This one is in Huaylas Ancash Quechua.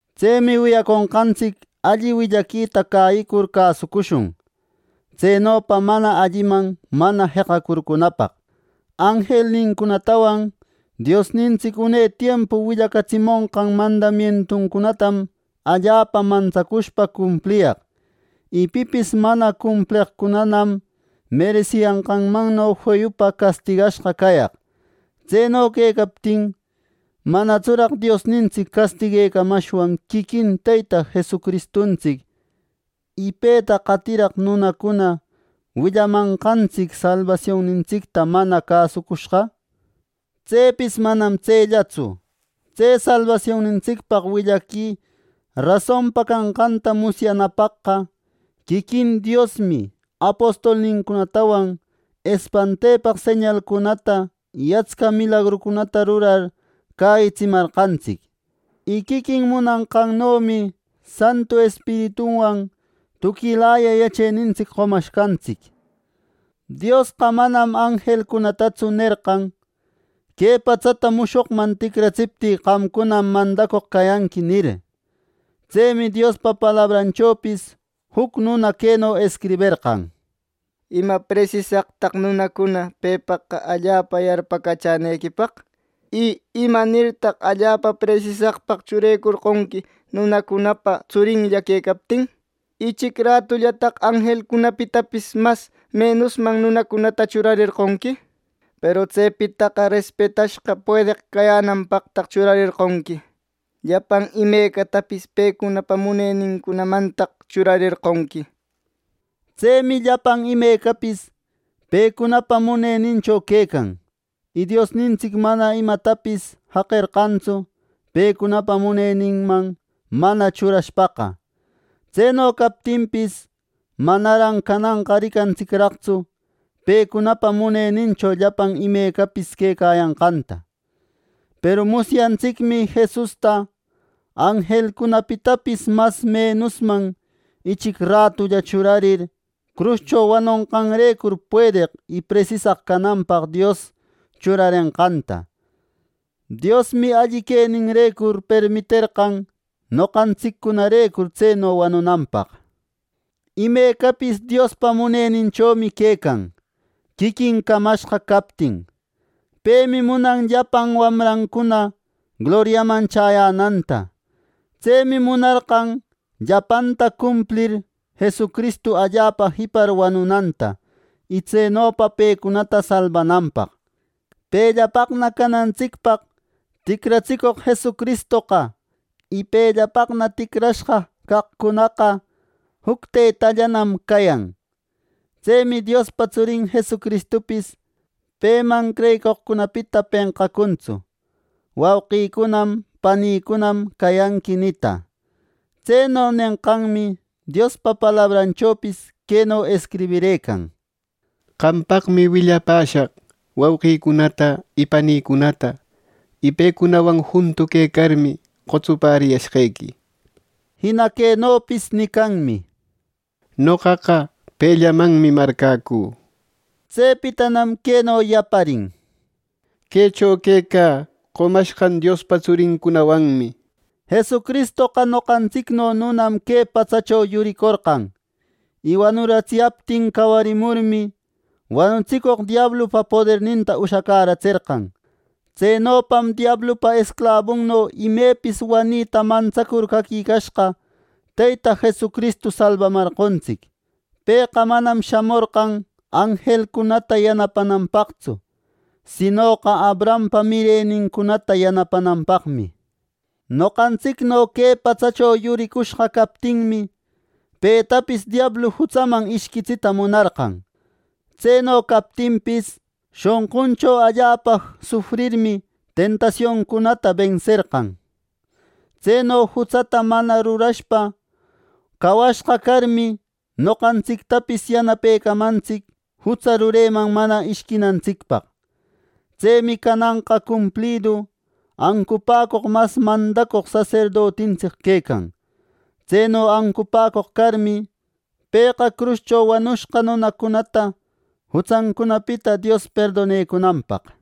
Tsemi wiyaconqantsic alli willaquita cäyicur cäsucushun, tsenopa mana alliman mana jeqacurcunapaq. Anjelnincunatawan Diosnintsic une tiempu willacatsimonqan mandamientuncunatam allapa mantsacushpa cumpliyaq, y pipis mana cumpleqcunam meresiyanqanmanno feyupa castigashqa cayaq. Tseno quecaptin ¿manatsuraq Diosnintsic castiguecamashwan quiquin Teyta Jesucristuntsic, y peta qatiraq nunacuna willamanqantsic salbasionnintsicta mana cäsucushqa! Tsepis manam tsellatsu, tse salbasionnintsicpaq willaqui rasonpa canqanta musyanapaqqa quiquin Diosmi apostolnincunatawan espantepaq señalcunata y atsca milagrucunata rurar cäyitsimarqantsic. Y quiquin munanqannomi Santu Espirituwan tuquilaya yachenintsic qomashqantsic. Diosqa manam anjelcunatatsu nerqan, “Que patsata mushoqman ticratsiptï qamcunam mandacoq cayanqui” nir. Tsemi Diospa palabranchopis juc nuna queno escriberqan: “¿Ima presisaqtaq nunacunaqa pepaq allapa yarpacachänequipaq? Y ¿imanirtaq allapa presisaqpaq churecorqonqui nunacunapa tsurinlla quecaptin? Ichic ratullataq anjelcunapitapis mas menusman nunacunata churarerqonqui; peru tsepitaqa respetashqa puedeq cayänanpaqtaq churarerqonqui. Llapan imecatapis pecunapa muneninmantaq churarerqonqui” nir. Tsemi llapan imecapis pecunapa munenincho quecan, y Diosnintsic manam imatapis jaqerqantsu pecunapa muneninman mana churashpaqa. Tseno captinpis, manaran cananqa ricantsicraqtsu pecunapa munenincho llapan imecapis quecayanqanta. Peru musyantsicmi Jesusta, anjelcunapitapis mas menusman ichic ratulla churarir, cruscho wanonqanrecur puedeq y presisaq cananpaq Dios churarenqanta. Diosmi alli queninrecur permiterqan noqantsiccunarecur tseno wanunanpaq. Imecapis Diospa muneninchommi quecan, quiquin camashqa captin. Pemi munan llapan wamrancuna gloriaman chäyänanta. Tsemi munarqan llapanta cumplir Jesucristu allapa jipar wanunanta, y tsenopa pecunata salbananpaq. Pellapaqna canantsicpaq ticratsicoq Jesucristoqa, y pellapaqna ticrashqa caqcunaqa juc Teytallanam cayan. Tsemi Diospa tsurin Jesucristupis peman creyicoqcunapita penqacuntsu “Wauqïcunam, panïcunam cayanqui” nita. Tseno nenqanmi Diospa palabranchopis queno escribirëcan: “Qampaqmi willapäshaq wauqïcunata y panïcunata y pecunawan juntu quecarmi qotsupäriyashqequi” nir. Jina quenopis nicanmi: “Noqaqa pellamanmi marcäcü” nir. Tsepitanam queno yaparin: “Quecho quecä qomashqan Diospa tsuricunawanmi” nir. Jesucristoqa noqantsicno nunam que patsacho yuricorqan, y wanuratsiyaptin cawarimurmi, wanutsicoq diablupa poderninta ushacäratserqan. Tsenopam diablupa esclabunno imepis wanita mantsacur caquicashqa, Teyta Jesucristu salbamarqontsic. Pëqa manam shamorqan anjelcunata yanapananpaqtsu, sinoqa Abrahampa mirenincunata yanapananpaqmi. Noqantsicno que patsacho yuricushqa captinmi, petapis diablu jutsaman ishquitsita munarqan. Tseno captinpis, shonquncho allapa sufrirmi tentasioncunata benserqan. Tseno jutsata mana rurashpa cawashqa carmi, noqantsictapis yanapecamantsic jutsa rureman mana ishquinantsicpaq. Tsemi cananqa cumplidu ancupäcoq mas mandacoq saserdotintsic quecan. Tseno ancupäcoq carmi, pëqa cruscho wanushqa nunacunata jutsancunapita Dios perdonecunanpaq.